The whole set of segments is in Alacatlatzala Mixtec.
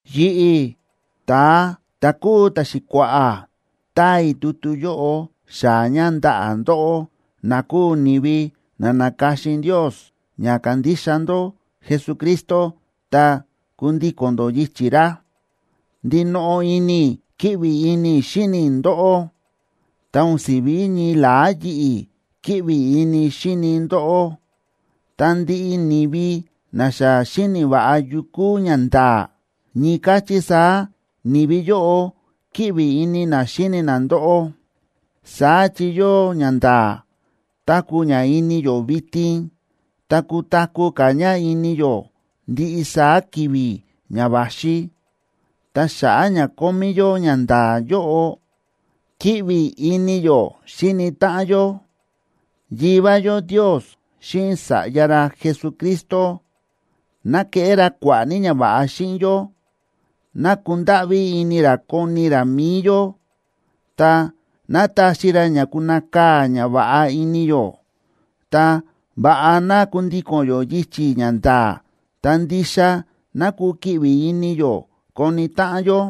Yi̱ꞌi̱, ta̱a ta̱ kúu ta̱xi̱kua̱ꞌa̱, táa i̱ tutu yóꞌo xaa̱ ña ndaꞌa̱ ndóꞌó, na kúu ni̱vi na na̱ka̱xin Ndios ña kandixa ndó Jesucristo ta kundíko̱n ndó yichi̱ ra. Ndinoꞌo ini i̱ kíꞌvi ini i̱ xíni i̱ ndóꞌó, ta o̱n si̱ví ñii la̱á yi̱ꞌi̱ kíꞌvi ini i̱ xíni i̱ ndóꞌó, ta ndiꞌi ni̱vi na xa xíni̱ va̱ꞌa yu kúu ñanda̱a̱, ñii káchí saá ni̱vi yóꞌo kíꞌvi ini na xíni na ndóꞌó. Saá chi yóo ñanda̱a̱ táku̱ ña ini yó vitin, ta kutaku̱ ka̱ ña ini yó ndiꞌi saá ki̱vi̱ ña va̱xi, ta xa̱ꞌa̱ ña kómí yó ñanda̱a̱ yóꞌo, kíꞌvi ini yó xíni táꞌan yó. Yivá yó Ndios xíꞌin Sa̱ꞌya ra Jesucristo, ¡ná keꞌé ra kua̱ꞌa̱ ní ñava̱ꞌa xíꞌin yó! ¡Ná kundáꞌví ini ra koni ra mi̱i yó! Ta, ¡ná taxi ra ña kunakaa̱ ñava̱ꞌa ini yó! Ta, ¡va̱ꞌa ná kundíko̱n yó yichi̱ ñanda̱a̱, ta ndixa ná kukiꞌvi ini yó koni táꞌan yó!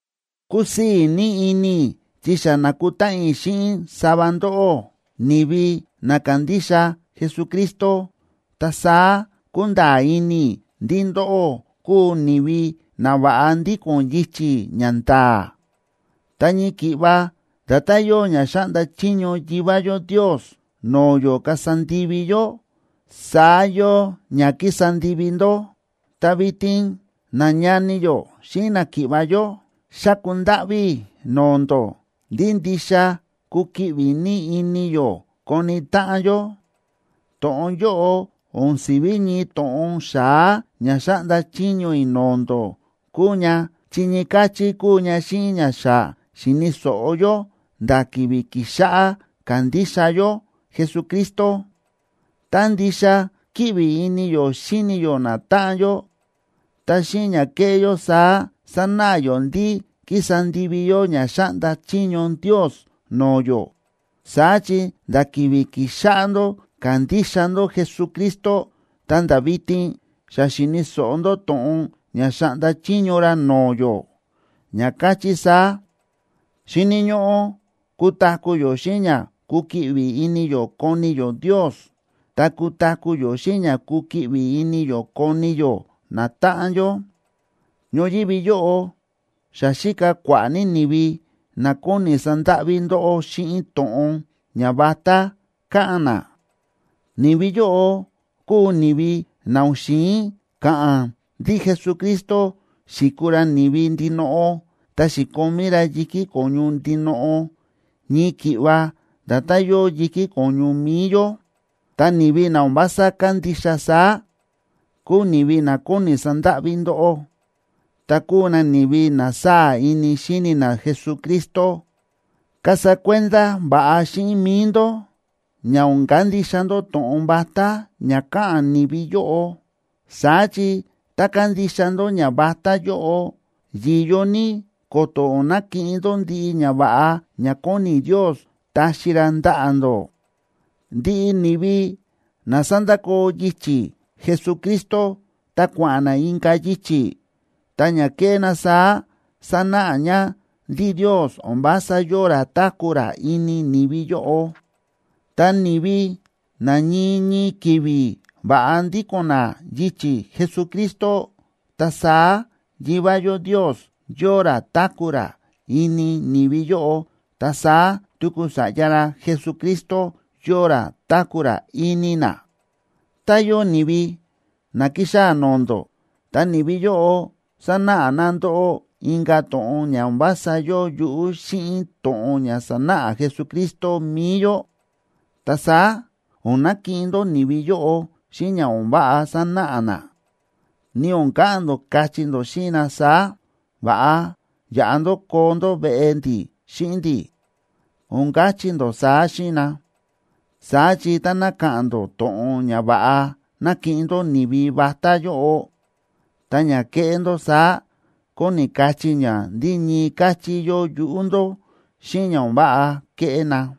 Kúsii̱ ní ini i̱ chi xa na̱kutáꞌan i̱ xíꞌin sava ndóꞌó, ni̱vi na kándixa Jesucristo, ta saá kúnda̱a̱ ini i̱ ndí ndóꞌó kúu ni̱vi na va̱ꞌa ndíko̱n yichi̱ ñanda̱a̱. Ta ñii ki̱ꞌva nda̱tán yóo ña xáꞌnda chiño Yivá yó Ndios no̱o̱ yó kasa ndivi yó, saá yóo ña kísa ndivi ndó. Ta vitin, nañani yó xíꞌin náki̱ꞌva̱ yó, xáku ndáꞌví i̱ no̱o̱ ndó ndí ndixa kukiꞌvi ní ini yó koni táꞌan yó. To̱ꞌon yóꞌo o̱n si̱ví ñii to̱ꞌon xa̱á ña xáꞌnda chiño i̱ no̱o̱ ndó kúu ña, chi ñii káchí kúu ña xíꞌin ña xa xi̱ni̱ so̱ꞌo yó nda̱ ki̱vi̱ ki̱xáꞌá kándixa yó Jesucristo. Tá ndixa kíꞌvi ini yó xíni yó natáꞌan yó, ta xíꞌin ña kéꞌé yó saá sánáꞌa yó ndí kísa ndivi yó ña xáꞌnda chiño Ndios no̱o̱ yó. Saá chi nda̱ ki̱vi̱ ki̱xáꞌá ndó kandixa ndó Jesucristo ta̱nda̱ vitin, xa xíni̱ so̱ꞌo ndó to̱ꞌon ña xáꞌnda chiño ra no̱o̱ yó, ña káchí saá: Xíni̱ ñóꞌó kutaku̱ yó xíꞌin ña kukiꞌvi ini yó koni yó Ndios, ta kutaku̱ yó xíꞌin ña kukiꞌvi ini yó koni yó natáꞌan yó. Ñoyívi yóꞌo xa xíka kua̱ꞌa̱ ní ni̱vi na kóni sandáꞌví ndóꞌó xíꞌin to̱ꞌon ñavatá káꞌa̱n na. Ni̱vi yóꞌo kúu ni̱vi na o̱n xi̱in ka̱ꞌa̱n ndí Jesucristo xi̱kuu ra ni̱vi ndinoꞌo, ta xi̱komí ra yi̱kí ko̱ñu ndinoꞌo, ñii ki̱ꞌva nda̱tán yóo yi̱kí ko̱ñu mi̱i yó. Ta ni̱vi na o̱n vása kándixa saá, kúu ni̱vi na kóni sandáꞌví ndóꞌó, ta kúu na ni̱vi na sáa̱ ini xíni na Jesucristo. Kasa kuenda va̱ꞌa xíꞌin mi̱i ndó ña o̱n kandixa ndó to̱ꞌon vatá ña káꞌa̱n ni̱vi yóꞌo. Saá chi tá kandixa ndó ñavatá yóꞌo, yi̱yo ní ko̱to̱ o̱n nakiꞌin ndó ndiꞌi ñava̱ꞌa ña kóni Ndios taxi ra ndaꞌa̱ ndó. Ndiꞌi ni̱vi na sa̱ndakoo yichi̱ Jesucristo ta kua̱ꞌa̱n na inka̱ yichi̱, ta ña kéꞌé na saá sánáꞌa ña ndí Ndios o̱n vása yóo ra táku̱ ra ini ni̱vi yóꞌo. Ta ni̱vi na ñii ñii ki̱vi̱ va̱ꞌa ndíko̱n na yichi̱ Jesucristo, ta saá Yivá yó Ndios yóo ra táku̱ ra ini ni̱vi yóꞌo, ta saá tuku Sa̱ꞌya ra Jesucristo yóo ra táku̱ ra ini na. Tá yóo ni̱vi na kixaa̱ no̱o̱ ndó, ta ni̱vi yóꞌo sanáꞌa na ndóꞌó inka̱ to̱ꞌon ña o̱n vása yóo yuꞌú xíꞌin to̱ꞌon ña sa̱náꞌa Jesucristo mi̱i yó, ta saá o̱n nakiꞌin ndó ni̱vi yóꞌo xíꞌin ña o̱n váꞌa sánáꞌa na, ni o̱n ka̱ꞌa̱n ndó kachí ndó xíꞌin na saá: “Va̱ꞌa yaꞌa ndó koo ndó veꞌe ndi̱ xíꞌin ndi̱.” O̱n kachí ndó saá xíꞌin na. Saá chi táná ka̱ꞌa̱n ndó to̱ꞌon ña va̱ꞌa nakiꞌin ndó ni̱vi vatá yóꞌo, ta ña kéꞌé ndó saá kóni kachí ña ndí ñii káchí yóo yuꞌú ndó xíꞌin ña o̱n váꞌa kéꞌé na.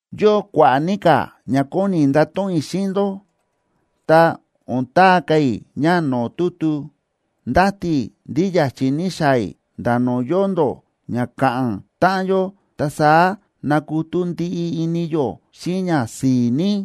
Yóo kua̱ꞌa̱ ní ka̱ ña kóni i̱ ndato̱ꞌon i̱ xíꞌin ndó, ta o̱n taa ka̱ i̱ ña no̱o̱ tutu. Ndáti i̱ ndí ya̱chi̱ ní xaa̱ i̱ nda̱ no̱o̱ yóo ndó ña ka̱ꞌa̱n táꞌan yó, ta saá nakutú ndiꞌi ini yó xíꞌin ñasi̱i̱ ní.